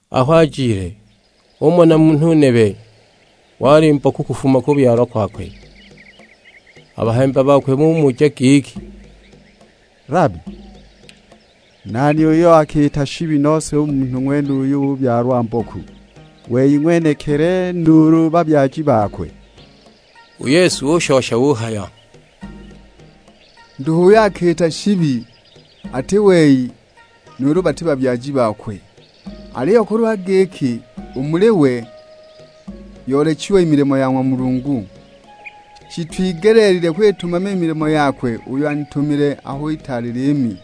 Aho ajile, umona munhu nebe wali mboku kufuma kubyalwa kwakwe. A bahemba bakwe bumuja giki, "Labi, nani uyo akiita shibi nose u munhu ng'wenuyu ubyalwa mboku, wei ng'wenekili, nuulu babyaji bakwe?" U Yesu ushosha uhaya, "Nduhu uyo akiita shibi; ati wei nuulu bati babyaji bakwe. Aliyo kulwa giki, u muli we yoolechiwe milimo ya ng'wa Mulungu. Shitwigeleelilwe kwitumama i milimo yakwe uyo anitumile aho itaali liimi;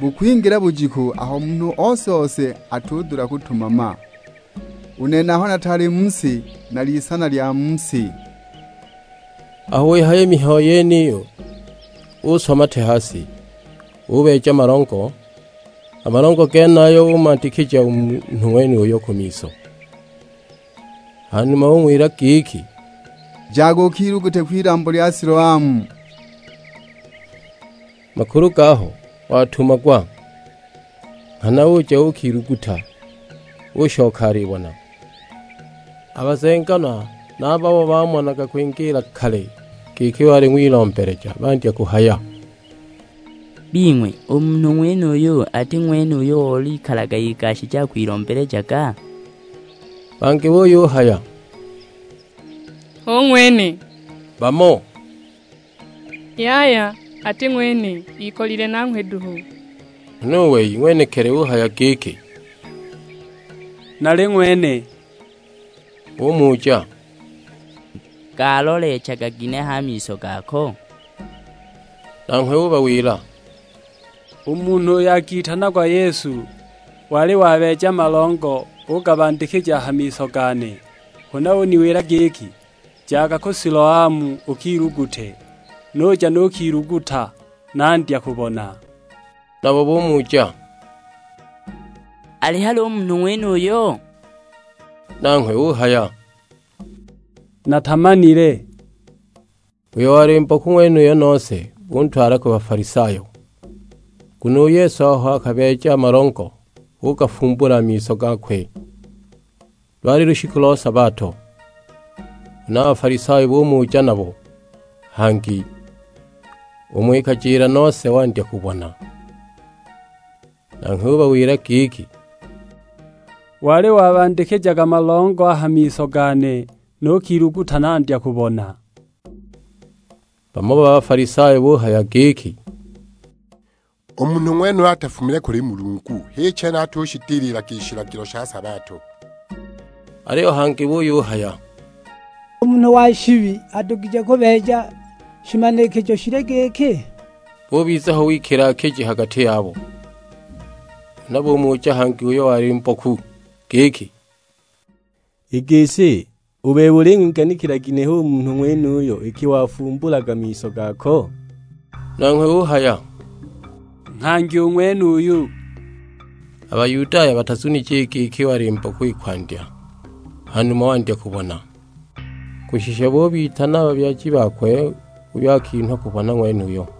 bukwingila bujiku aho munhu ose-ose atudula kutumama. U nene aho nataali mu si, nali Isana lya mu si." Aho wihaya i mihayo yeniyo uswa mate ha si, ubeeja malongo; a malongo genayo umandikija u munhu ng'wenuyo ku miso. Hanuma ung'wila giki, "Jaga ukilugute kwilambo lya Siloamu;" (makulu gaho: Watumagwa). Nghana uja uukiluguta, ushoka alibona. A bazenganwa na a babo bamonaga kwingiila kale giki wali ng'wilombeleja bandya kuhaya, "Bing'we, u munhu ng'wenuyu ati ng'wene uyo olikalaga igashije akwilombelejaga?" Bangi buyuhaya, "Hu ng'wene," bamo, "Yaya ati ng'wene, ikolile nanghwe duhu." Huna u wei ng'wenekili uhaya giki, "Nali ng'wene!" Bumuja, "Galoleechaga ginehe a miso gako?" Nanghwe ubawila, "U munhu uyo akitanagwa Yesu wali wabeeja malongo ugabandikija a ha miso gane, huna uniwila giki, 'Jaga ku Siloamu ukilugute;' nuja nukiluguta, nandya kubona!" Nabo bumuja, "Ali hali u munhu ng'wenuyo?" Nanghwe uhaya, "Natamanile!" Uyo wali mboku ng'wenuyo nose buntwala ku Bafalisayo, nguno u Yesu aho akabeeja malongo ugafumbula a miso gakwe, lwali lushiku lo sabato. Huna a Bafalisayo bumuja nabo hangi, umo ikajila nose wandya kubona. Nanghwe ubawila giki, "Wali wabandikija malongo a ha miso gane nukiluguta nandya kubona." Bamo ba Bafalisayo buyuhaya giki, "U munhu ng'wenuyu atafumile kuli Mulungu, h'i chene atushidililaga i shilagilo sha sabato." Aliyo bangi buyuhaya, "U munhu wa shibi adugije kubeeja shimanikijo shili giki?" Bubiza ho wikila-kiji a ha gati yabo. Huna bumuja hangi uyo wali mboku; giki, "I gisi, u bebe uling'wiganikila ginehe u munhu ng'wenuyo iki wafumbulaga miso gako?" Nanghwe uhaya, "Nghangi u ng'wenuyo!" A Bayudaya batazunije i giki wali mboku i kwandya hanuma wandya kubona, kushisha bubitana a babyaji bakwe uyo akinhwa kubona ng'wenuyo.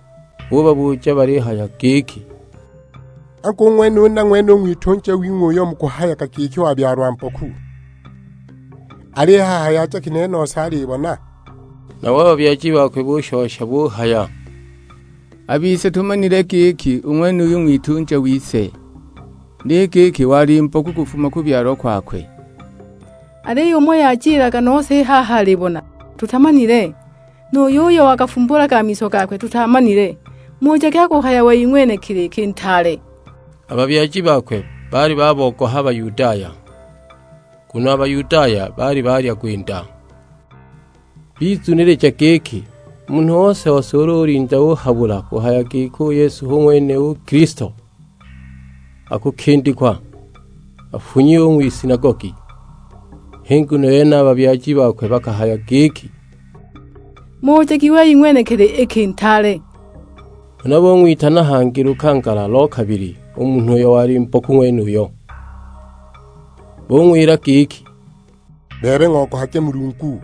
Bubabuja balihaya giki; "Angu, u ng'wenuyu na ng'wene u ng'witunja wing'we uyo mukuhayaga giki wabyalwa mboku? Al'i haha yajaga ginehe nose alibona?" Nabo a babyaji bakwe bushosha buhaya, "A bise tumanile giki u ng'wenuyu ng'witunja wise, ni giki wali mboku kufuma kubyalwa kwakwe. Aliyo umo yajilaga nose i haha alibona, tutamanile. Nu yuyo wagafumbulaga a miso gakwe tutaamanile; mujagi akuhaya wei ng'wenekili iki ntaale." A babyaji bakwe baali babogoha a Bayudaya, nguno a Bayudaya baali balya gwinda, bizunilija giki munhu ose-ose ulu ulinda uhabula kuhaya giki u Yesu hu ng'wene u Kilisto, akukindikwa; afunyiwe u ng'wisinagogi. H'i nguno yene a babyaji bakwe bakahaya giki, "Mujagi wei ng'wenekili iki ntaale!" Huna bung'witana hangi lukangala lo kabili u munhu uyo wali mboku ng'wenuyo. Bung'wila giki, "Bebe ng'ogohage Mulungu,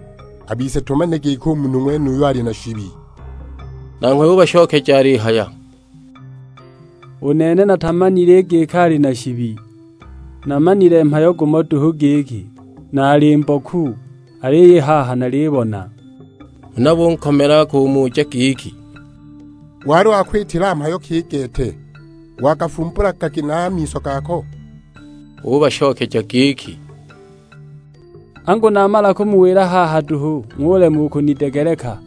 a bise tumanile giki u munhu ng'wenuyu ali na shibi!" Nanghwe ubashokeja alihaya, "U nene natamanile i giki ali na shibi, namanile mhayo gumo duhu, giki naali mboku; aliyo i haha nalibona!" Huna bunkomela kumuja giki, "Wali wakwitila mhayo ki i gete? Wagafumbulaga ginehe a miso gako?" Ubashokeja giki, "Angu namala kumuwila haha duhu ng'ulema u kunidegeleka,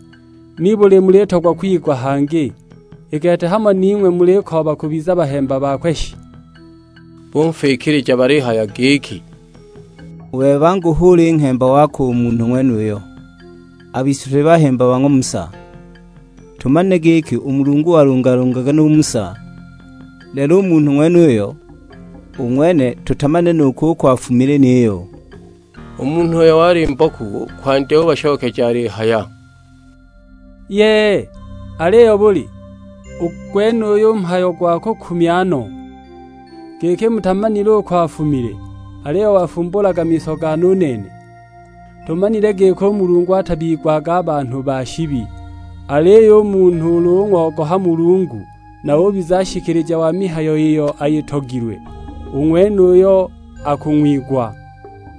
nibuli mulitogwa kwigwa hangi? I gete hamo ning'we mulikooba kubiza bahemba bakwe shi?" Bunfikilija balihaya giki, "U bebe angu hu uli nghemba wakwe u munhu ng'wenuyo; a bise tuli bahemba ba ng'wa Musa. Tumanile giki u Mulungu walungalungaga nu Musa; lelo u munhu ng'wenuyo, u ng'wene tutamanile nu kuko afumile niyo!" U munhu uyo wali mboku kwandya ubashokeja alihaya, "Yee! Aliyo buli, u gwenuyu mhayo gwa kukumya no, giki mutamanile uko afumile, aliyo wafumbulaga miso gane u nene! Tumanile giki u Mulungu atabigwaga a banhu ba shibi, aliyo u munhu ulu ung'ogoha Mulungu na ubiza nshikilija wa mihayo iyo ayitogilwe, u ng'wenuyo akung'wigwa.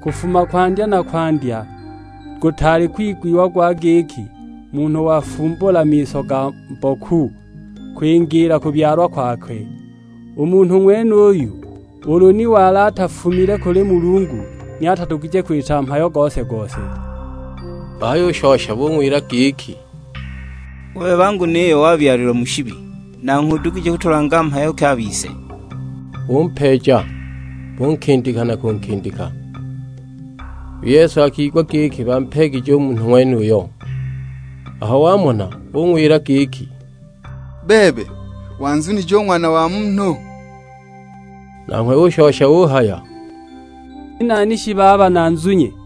Kufuma kwandya na kwandya, gutaali kwigwiwa gwa giki munhu wafumbula miso ga mboku kwingiila kubyalwa kwakwe. U munhu ng'wenuyu ulu ni wali atafumile kuli Mulungu, ni atadugije kwita mhayo gose-gose!" Bahayushosha bung'wila giki, "U bebe angu niyo wabyalilwa mu shibi, nangho udugije kutulanga mhayo ki a bise?" Bumpeeja, bunkindika na kunkindika! U Yesu akigwa giki bampeegije u munhu ng'wenuyo. Aho wamona ung'wila giki, "Bebe, wanzunije u Ng'wana wa Munhu?" Nanghwe ushosha uhaya, "Ni nani shi baba nanzunye?"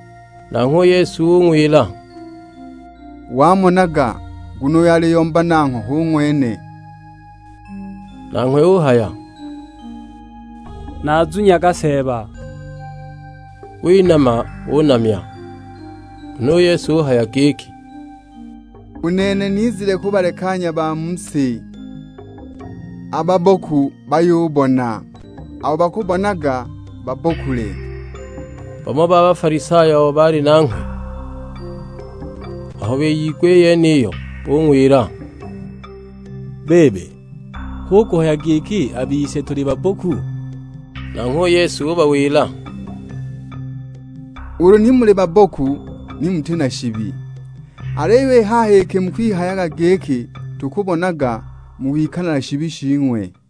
Nanghwe u Yesu ung'wila, "Wamonaga, nguno uyo aliyomba nangho hu ng'wene!" Nanghwe uhaya, "Nazunyaga Seeba!" Winama unamya. Huna u Yesu uhaya giki, "U nene nizile kubalekanya a ba mu si; a babboku bayubona, abo bakubonaga babbokule!" Bamo ba Bafalisayo abo baali nanghwe aho biyigwa i yeniyo bung'wila, "Bebe, hu kuhaya giki na a bise tuli babboku?" Nanghwe u Yesu ubawila, "Ulu ni muli babboku ni muti na shibi; aliyo i haha iki mukwihayaga giki, 'Tukubonaga,' mukwikala na shibi shing'we!"